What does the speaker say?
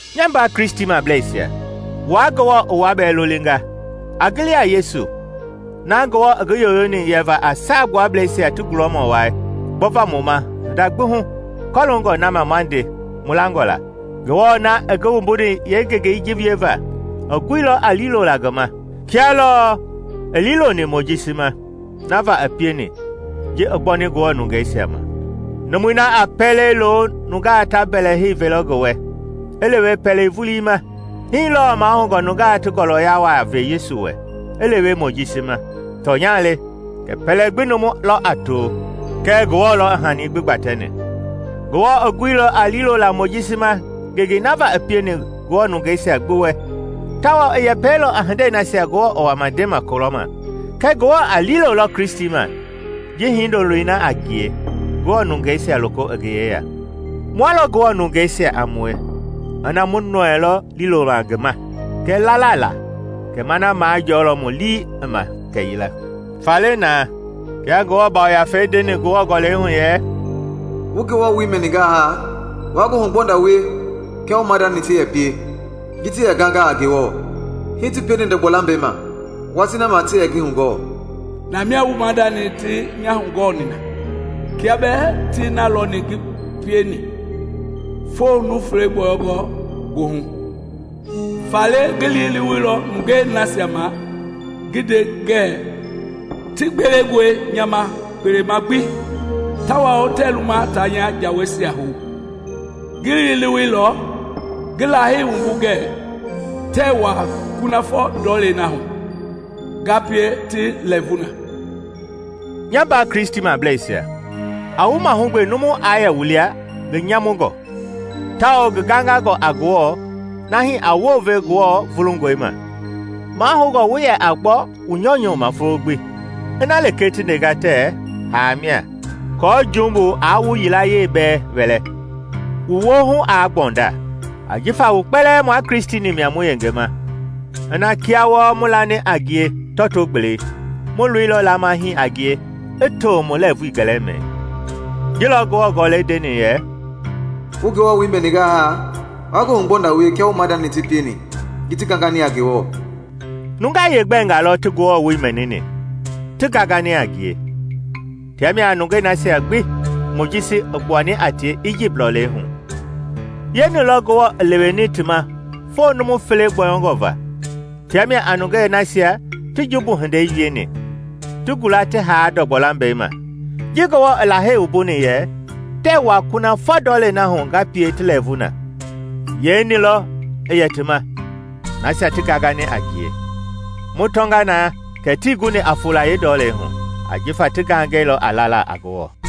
Nya mbaa Kristimableisia, wua Ngewɔ i wua bɛɛ lolinga! A gili a Yesu, na Ngewɔ i ngi yoyoni yɛva a Saagbuablɛisia ti gulɔmɔ wai gbɔva mu ma hinda gbi hu kɔloongɔ na ma ma nde mu langɔ la. Ngewɔ na i ngi wumbuni yeengengei ji wieva, i guilɔ a liilola ngi ma, kia lɔɔ i liiloni Mojisi ma na va i pieni ji i gbɔni Ngewɔ nungeisia ma. Numui na a pɛlei lo nungaa ta mbɛlɛhei velɔ ngi wɛ i lewe pɛlei vulii ma. Hii lɔɔ mahoungɔ nungaa ti ngɔlɔya waa ve Yesu wɛ i lewe Mojisi ma. Tɔnya le kɛ pɛlɛ gbi numu lɔ a to, kɛɛ Ngewɔ lɔ i hani gbi gbatɛni. Ngewɔ i guilɔ a liilola Mojisi ma ngengei na va i pieni Ngewɔ nungeisia gbi wɛ, tawao i yɛpɛilɔ a hindei nasia Ngewɔ i wama ndema kulɔma. Kɛɛ Ngewɔ a liilolɔ Kristi ma ji Hindoloi na a ngie Ngewɔ nungeisia loko i ngi yeya. Mua lɔ Ngewɔ nungeisia a mue ina mu nɔɛilɔ liilola ngi ma kɛɛ lala la kɛ ma na majɔɔlɔ mu lii i ma kɛyila. Faale na, kia Ngewɔ Yafei ndeni Ngewɔ Gɔlɛi hu yɛ, “Wu Ngewɔ woi mɛningaa haa, waa ngoohugbɔnda wie kia wu maadani ti yɛ pie ji ti yɛ ganga a Ngewɔ, hii ti pieni ndɔgbɔ-lambɛi ma watii na ma ti yɛ ngi hugɔɔ. Namia wu maadani ti nya hugɔɔni na, kia bɛɛ ti na lɔni ngi pieni foo numu fele gbɔyɔngɔ goohu. Faale ngi liileweilɔ nungei nasia ma ngi nde ngɛɛ, ‘Ti gbelengɔe nya ma kpelema gbi, tawao tɛɛ luma taa nya jaweisia hou.’ Ngi liileweilɔ, ngi Lahei wumbu ngɛɛ: ‘Tɛɛ wuaa kunafɔ ndɔlei na hu ngaa pie ti lɛɛvu na!’” Nya mbaa Kristimableisia, a wu mahugbe numu aa yɛ wu lia ngi nyamungɔ tawao ngi gangangɔ a Ngewɔ nahi a wounve Ngewɔ vulungɔi ma. Mahoungɔ wu yɛ a gbɔ wu nyɔunyɔu ma folo gbi, ina lekee ti ndenga tɛɛ “Haa” mia, aako jumbu aa wu yilayee bɛɛ wɛlɛ, wu woohu aa gbɔnda. Ajifa mu kpɛlɛɛ mua Kristi-ni mia mu yengema ina kia wɔɔ mu lani a ngie tɔto-gbelei, mu loilɔ lama hii a ngie i to mu lɛvui gɛlɛmɛi. Ji lɔ Ngewɔ Gɔlɛi ndeni yɛ, “Wu Ngewɔ woi mɛningaa haa, waa ngoohugbɔnda wie kia wu maadani ti pieni ji ti gangani a Ngewɔ.” Nungaa yeengbɛnga lɔ ti Ngewɔ woi mɛnini, ti gangani a ngie? Tia mia a nungei nasia gbi Mojisi i gbuani a tie Ijipt lɔlei hu. Yeeni lɔ Ngewɔ i liileweni ti ma foo numu fele gbɔyɔngɔ va? Tia mia a nungei nasia ti jumbu hindei wieni, ti gula ti haa ndɔgbɔ lambɛi ma. Ji Ngewɔ i Lahei wumbuni yɛ, “Tɛɛ wua kunafɔ ndɔlei na hu ngaa pie ti lɛɛvu na” yeeni lɔ i yɛ ti ma? Nasia ti gangani a ngie. Mu tɔnga na kɛ tii guni a fola yeendɔlei hu, ajifa ti gangɛilɔ a lala a Ngewɔ.